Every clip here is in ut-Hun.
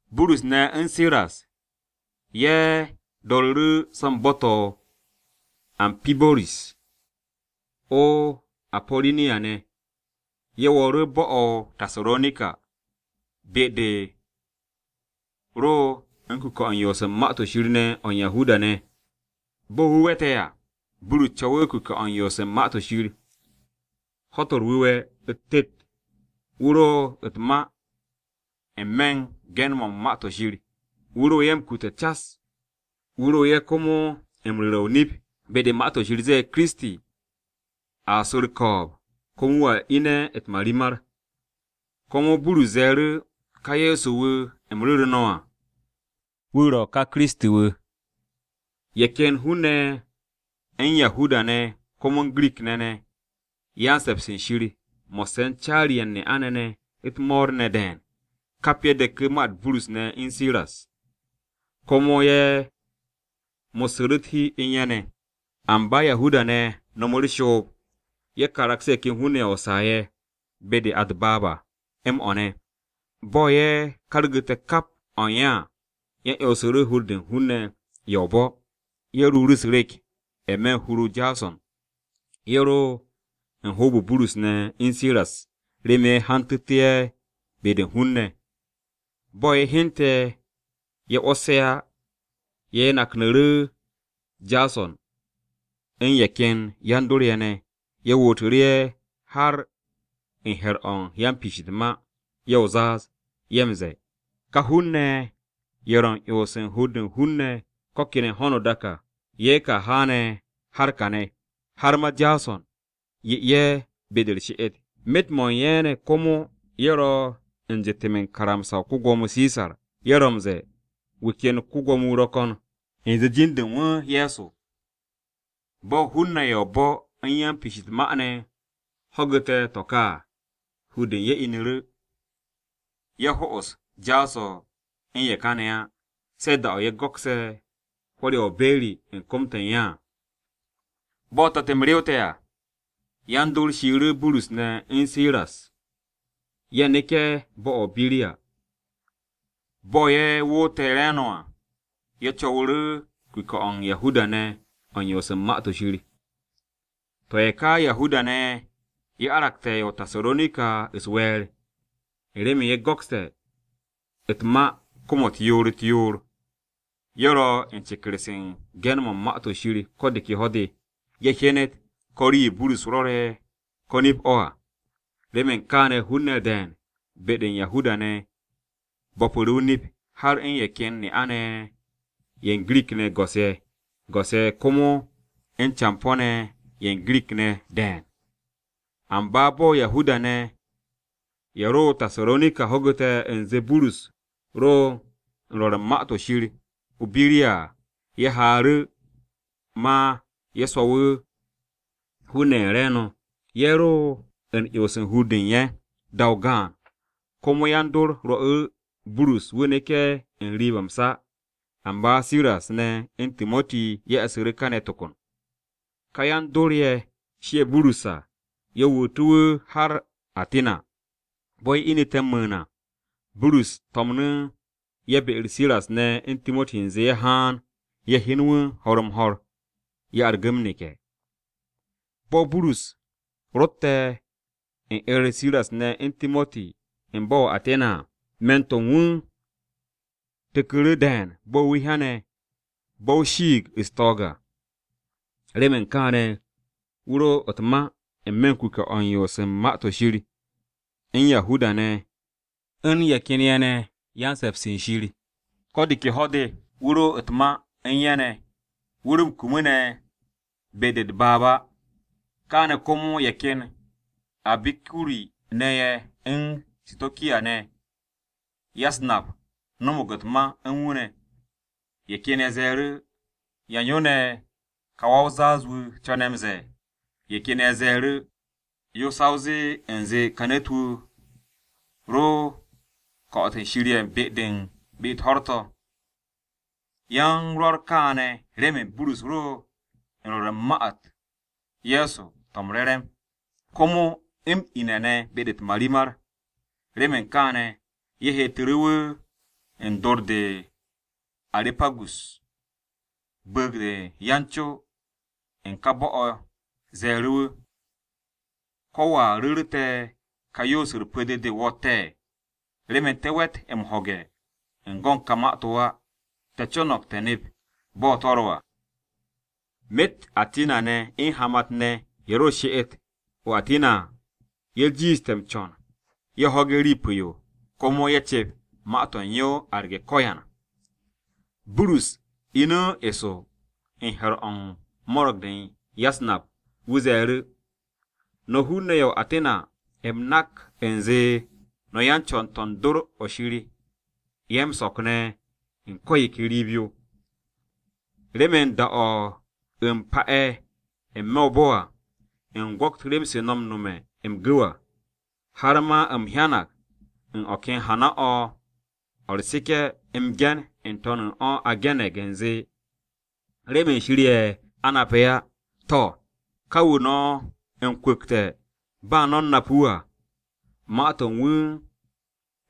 Burus ne̱ u̱n Siras ye̱ do̱ru̱ru̱ so̱ u̱n bo̱-to̱ o-Ampibo̱ris o-Apo̱ro̱niya ne̱. Ye̱ wo̱o̱ru̱ bo̱-o̱ o-Tasaronika, be-de ro u̱n kuke̱-o̱ u̱n yoos u̱n Ma-to̱ Shir ne̱ à o̱ u̱n Yahuda-ne̱. Bo̱ wu̱ we̱te̱ à, Burus co̱wu̱ kuke̱-o̱ u̱n yoos u̱n Ma-to̱ Shir. Ho̱-to̱ u̱r-Wu̱we̱ u̱t-tet, wu̱ ro u̱t-ma n-me̱ u̱n ge̱n-mo̱ u̱n Ma-to̱ Shir. Wu̱ ro ye̱ m-kute̱ cas, wu̱ ro ye̱ komo u̱n ru̱re̱ o-nip be-de Ma-to̱ Shir ze̱e̱ Kiristi a su̱ u̱r-ko̱o̱b, komo wu̱a ine̱ u̱t-marimar. Komo Burus ze̱e̱ru̱, “Ka Ye̱so-wu̱ u̱m ru̱ru̱ no̱ à, wu̱ ro̱ ka Kiristi-wu̱.” Ye̱ ken hun-ne̱ ye̱ u̱n Yahuda-ne̱ komo u̱n Girik-ne̱ ne̱ “Yan-se̱ps u̱n Shir” mo̱sse̱ u̱n caari-ye̱ u̱n ne'a-ne̱ ne̱ u̱t-mo̱o̱r ne̱ de̱e̱n, kap ye̱ deku̱ ma-u̱t Burus ne̱ u̱n Siras, komo ye̱ mo̱ssu̱ru̱ u̱t-hi u̱n ye̱ ne̱. Amba Yahuda-ne̱ no̱mu̱ u̱r-shoob, ye̱ karagsu̱ru̱ ye̱ ken hun-ne̱ ye̱ o-saa ye̱ be-de a u̱t-baab à m-o̱ ne̱. Bo̱ ye̱ kargu̱te̱ kap o̱ u̱n ye̱ à, ye̱ 'yonsu̱ru̱ hur-de u̱n hun-ne̱ ye̱ o-bo̱. Ye̱ ruuru̱ u̱s-rek n-me̱ u̱n hur-o Jaso̱n. Ye̱ ro u̱n hoob-o Burus ne̱ u̱n Siras remen ye̱ hantu̱tú̱ ye̱ be-de u̱n hun-ne̱. Bo̱ ye̱ hyente̱ ye̱ 'wo̱s ye̱ á, ye̱ naknu̱ru̱ Jaso̱n u̱n ye̱ ken yan-dor-ye̱ ne̱, ye̱ wootu̱ru̱ ye̱ har u̱n he̱r-o̱ u̱n yan-piish u̱t-ma. Ye̱ o-zaaz, ye̱ m-ze̱e̱, “Ka hun-ne̱ ye̱, ye̱ ro̱ m-'yons u̱n hur-de u̱n hun-ne̱ ko̱ kene̱ ho̱no o-dak à, ye̱ ka haane̱ har kane̱. Har ma Jaso̱n 'ye ye̱ be-de u̱r-she'et. Myet-mo̱ u̱n ye̱ ne̱ komo ye̱ ro̱ m-jetem u̱n karamsa-o ko-Gwo̱mo Sisar. Ye̱ ro̱ m-ze̱e̱ wu̱ ken ko-Gwo̱mo-wu̱ ro̱ ko̱n, u̱nze jin-de u̱n wu̱ Ye̱so.” Bo̱ hun-ne̱ ya-o-bo̱ u̱n yan-piish u̱t-ma ne̱ ho̱gu̱te̱ to̱ ka à, hur-de u̱n ye̱ inu̱ru̱. Ye̱ ho'os Jaso̱n u̱n ye̱ ka ne̱ á, se̱ da-o̱ ye̱ go̱kse̱ hwo̱r-ye̱ o-be̱ri u̱n kom-to̱ u̱n ye̱ à. Bo̱ te̱t-m rewte̱ à, yan-dor shiiru̱ Burus ne̱ u̱n Siras ye̱ neke̱ bo̱-o̱ o-Biriya. Bo̱ ye̱ woote̱ re̱e̱no̱ à, ye̱ co̱wu̱ru̱ kuke̱-o̱ u̱n Yahuda-ne̱ o̱ u̱n yoos u̱n Ma-to̱ Shir. To̱ ye̱ ka Yahuda-ne̱ ye̱, ye̱ aragte̱ ye̱ o-Tasaronika u̱s-we̱e̱r, u̱n remen ye̱ go̱kste̱ u̱t-ma kom-u̱t yoor-u̱t-yoor. Ye̱ ro̱ u̱n ceker-se u̱n ge̱n-mo̱ u̱n Ma-to̱ Shir ko̱ de ke ho̱-de, ye̱ hyenet ko̱ rii-yo Burus rwo̱re̱, ko̱ nip-o̱ à. Remen kaane̱ hun-ne̱ de̱e̱n be-de u̱n Yahuda-ne̱ bo̱pu̱ru̱ o-nip, har u̱n ye̱ ken ne'a-ne̱ ye̱ ne̱ ye̱ u̱n Girik-ne̱ go̱s-ye̱, go̱s-ye̱ komo u̱n campo̱-ne̱ ne̱ ye̱ u̱n Girik-ne̱ de̱e̱n. Amba bo̱ Yahuda-ne̱ ye̱ ro o-Tasaronika ho̱gu̱te̱ u̱nze Burus ro u̱n rwo̱r u̱n Ma-to̱ o-Shir o-Biriya à, ye̱ haaru̱ ma ye̱ swo̱wu̱ hun-ne̱ u̱n ye̱ re̱e̱no̱, ye̱ ro u̱n 'yons u̱n hur-de u̱n ye̱. Da-o gaan, komo yan-dor rwo̱'u̱ru̱ Burus wu̱ neke̱ n-riib m-sa. Amba Siras ne̱ u̱n Timoti ye̱ e̱su̱ru̱ kane̱ to kon. Ká yan-dor-ye̱ shie̱ Burus à, ye̱ wootu̱ wu̱ har o-Atina. Bo̱ ye̱ inite̱ m-mu̱u̱n à, Burus to̱mnu̱ ye̱ be-u̱r Siras ne̱ u̱n Timoti u̱nze ye̱ haan ye̱ hyen wu̱ ho̱r-m-ho̱r, ye̱ argu̱ m-neke̱. Bo̱ Burus rotte̱ u̱n 'er-u̱r Siras ne̱ u̱n Timoti u̱n bo̱-o̱ o-Atina à, me̱n-to̱ u̱n wu̱ tu̱ku̱ru̱ de̱e̱n bo̱ wu̱ hyane̱ bo̱-o shiig u̱n pyo-se m-gir à. Remen kaane̱ wu̱ ro u̱t-ma n-me̱ u̱n kuke̱-o̱ u̱n yoos u̱n Ma-to̱ Shir u̱n Yahuda-ne̱, u̱n ye̱ ken ye̱ ne̱ “Yan-se̱ps u̱n Shir.” Ko̱ de ke ho̱-de wu̱ ro u̱t-ma u̱n ye̱ wu̱ ro m-kum ne̱ be-de u̱t-baab à. Kaane̱ komo ye̱ ken Abikuri-ne̱ ye̱ u̱n Sitokiya-ne̱ ya-u̱s-nap no̱mo̱g u̱t-ma u̱n wu̱ ne̱. Ye̱ ken ye̱ ze̱e̱ru̱, “¿Yan yo ne̱ ka wa-o-zaaz-wu̱ co̱ne̱ m-ze̱e̱?” Ye̱ ken ye̱ ze̱e̱ru̱, “Yo ro̱ sa o zee u̱nze ka ne̱t-wu̱ ro̱ u̱n ko̱'o̱t shir-ye̱ u̱n u̱n be-u̱t ho̱r-to̱.” Ye̱ u̱n rwo̱r kaane̱ remen Burus ro u̱n rwo̱r u̱n Ma-u̱t Ye̱so to̱ m-Re̱re̱m, komo m-ine̱ ne̱ be-de u̱t-marimar. Remen kaane̱, ye̱ heetu̱ru̱ wu̱ u̱n dor-de o-Arepagus. Bu̱u̱g-de yan-co u̱n ka bo̱-o̱ ze̱e̱ru̱ wu̱, “¿Ko̱ wo̱a ru̱ru̱ te̱ ka yoos-u̱r pu̱-de de o wo̱tte̱? Remen te̱ we̱t m-ho̱ge̱ u̱n go̱n to̱ ka ma-to̱ á. Te̱ co̱no̱g te̱ nep bo̱ to̱ ro̱ à.” (Myet Atina-ne̱ u̱n hamat-ne̱ ne̱ ye̱ ro̱ u̱r-she'et o-Atina à, ye̱ jiishte̱ m-co̱n ye̱ ho̱ge̱ rii pu̱-yo komo ye̱ cep ma-to̱ u̱n yo, arge̱ ko̱yan.) Burus inu̱ eso u̱n he̱r-o̱ u̱n mo̱ro̱g-de u̱n ya-u̱s-nap, wu̱ ze̱e̱ru̱, “No̱ hun-ne̱ ye̱ o-Atina, u̱m nak u̱nze no̱ yan-co̱n-to̱ u̱n dor-o̱ shir-ye̱ m-so̱k ne̱ u̱n ko̱ yo ke riib-yo. Remen da-o̱ u̱m m-pa'e̱ n-me̱ o-bo̱ à, u̱m gwo̱t rem-se no̱ u̱n nome̱ m-gu̱w à, har ma u̱m hyanag u̱n o̱ ken hana-o̱ o̱ u̱r-seke̱ m-ge̱n ne̱ n-to̱n u̱n o̱ a ge̱ne̱g u̱nze, ‘Remen Shir ye̱ a nape̱ á.’ To̱, ka wu̱ no̱ m-kwu̱kte̱ ba no̱ u̱n nap wu̱ à, ma-to̱ u̱n wu̱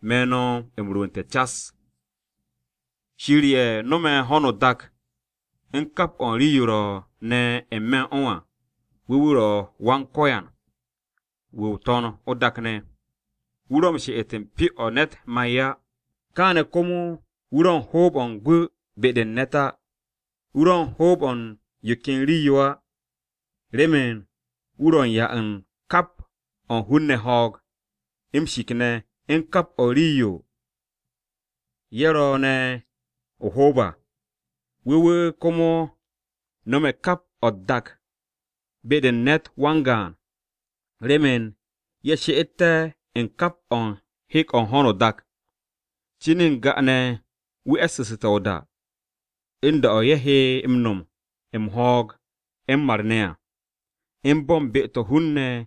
me̱ no̱ m-rwu̱u̱nte̱ cas. “Shir ye̱ no̱me̱ ho̱no o-dak u̱n kap o̱ u̱n rii-yo ro̱ ne̱ n-me̱ u̱n o̱ à, wu̱ wu̱ ro̱ Wan-Ko̱yan wu̱ o-To̱n o-dak ne̱. Wu̱ ro̱ m-she'et u̱n pyo-o̱ ne̱t ma'e̱ á. Kaane̱ komo wu̱ ro̱ u̱n hoob-o̱ u̱n gwu̱ be-de u̱n ne̱t á. Wu̱ ro̱ u̱n hoob-o̱ u̱n yo ken rii-yo á, remen wu̱ ro̱ u̱n 'ya u̱n kap o̱ u̱n hun-ne̱ ho̱o̱g, m-shik ne̱ u̱n kap o̱ u̱n rii-yo ye̱ ro̱ ne̱ o-hoob à. Wu̱ wu̱ komo nome̱ kap o̱ u̱t-dak be-de u̱n ne̱t wan-gaan, remen ye̱ she'etté̱ u̱n kap o̱ u̱n hek-o̱ u̱n ho̱no o-dak. Cin u̱n n-ga ne̱ wu̱ e̱ssu̱su̱te̱ o-da, u̱n da-o̱ ye̱ he m-no̱m m-ho̱o̱g m-mar ne̱ à, u̱n bo̱ u̱n be-to̱ hun-ne̱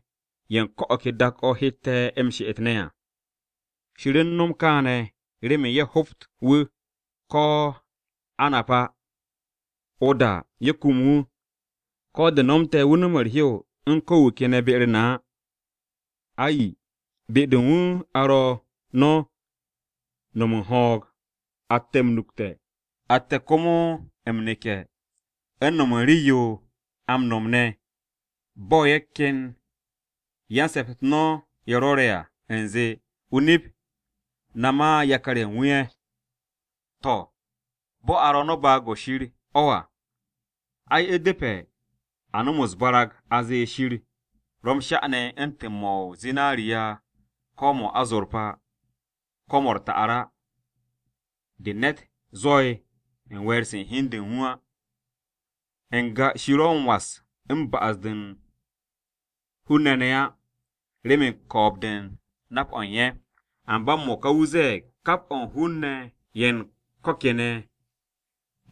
ye̱ u̱n ko̱ o̱ ke dak-o̱ hette̱ m-she'et ne̱ à. Shir u̱n no̱m kaane̱ remen ye̱ hobt wu̱, ko̱ a nap á. O-da ye̱ kum wu̱, ko̱ de̱ nomte̱ wu̱ no̱m u̱r-hew u̱n ko̱ wu̱ ke ne̱ be u̱n na á. Ai, ‘Be-de u̱n wu̱ a ro̱ no̱ u̱n no̱m m-ho̱o̱g, atte̱ m-nukte̱, atte̱ komo u̱n m-neke̱ u̱n no̱m u̱n rii-yo a m-no̱m ne̱,’ bo̱ ye̱ ken yan-se̱p-u̱t no̱ ye̱ rwo̱re̱ à u̱nze, ‘O-nip, na ma yakar-ye̱ u̱n wu̱ ye̱.’ “To̱, bo̱ a ro̱ no̱ baag-o̱ Shir o̱ à, ai, u̱depe̱ a no̱m u̱s-barag a zee Shir ro̱ m-sha ne̱ u̱ntu̱n mo̱ o-zinariya, ko̱ mo̱ o-azorpa, ko̱ mo̱ u̱r-ta'ar á, de ne̱t zwo̱'e̱ u̱n we̱e̱r-se u̱n hi u̱n de u̱n wu̱ á. N-ga Shir ro m-was u̱n ba'as-to̱ u̱n hun-ne̱ ne̱ á, remen ko̱o̱b-de u̱n nap-o̱ u̱n ye̱. Amba m-mo̱ka, wu̱ ze̱e̱g kap o̱ u̱n hun-ne̱ ye̱ u̱n ko̱ kene̱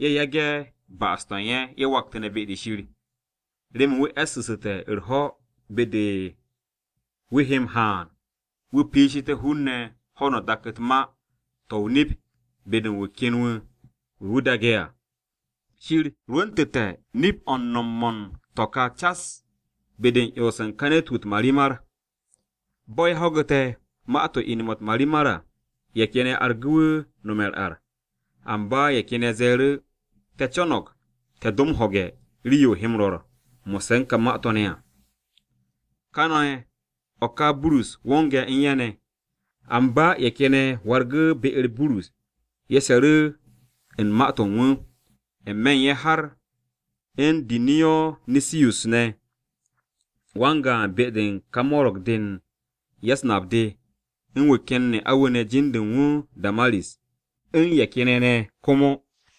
ye̱ yage̱ ba'as-to̱ u̱n ye̱, ye̱ waktu̱ne̱ be-de Shir. Remen wu̱ e̱ssu̱ssu̱te̱ u̱r-ho̱ de wu̱ he m-haan wu̱ piishité̱ hun-ne̱ ho̱no o-dak u̱t-ma to̱ o-nip be-de u̱n wu̱ ken wu̱, wu̱ wu̱ daage̱ à. Shir rwu̱ntu̱te̱ nip-o̱ u̱n no̱m-mo̱ u̱n to̱ ka cas be-de u̱n 'yons u̱n ka ne̱t-wu̱ u̱t-marimar.” Bo̱ ye̱ ho̱gu̱te̱ ma-to̱ m-ine̱ u̱t-marimar à, ye̱ ken ye̱ argu̱ wu̱ nome̱ u̱r-ar. Amba ye̱ ken ye̱ ze̱e̱ru̱, “Te̱ co̱no̱g te̱ do m-ho̱ge̱ rii-yo o he m-rwo̱r mo̱sse̱ u̱n ka ma-to̱ ne̱ à.” Kane̱ o̱ ka Burus wonge̱ u̱n ye̱ ne̱. Amba ye̱ ken ye̱ wargu̱ru̱ be-u̱r Burus ye̱ she̱ru̱ u̱n ma-to̱ u̱n wu̱, n-me̱ u̱n ye̱ har u̱n Diyonisiyus ne̱, wan-gaan be-de u̱n ka mo̱ro̱g-de u̱n ya-u̱s-nap de, u̱n wu̱ ken ne'a-wu̱ ne̱ jin-de u̱n wu̱ Damaris, u̱n ye̱ ken ye̱ ne̱ komo.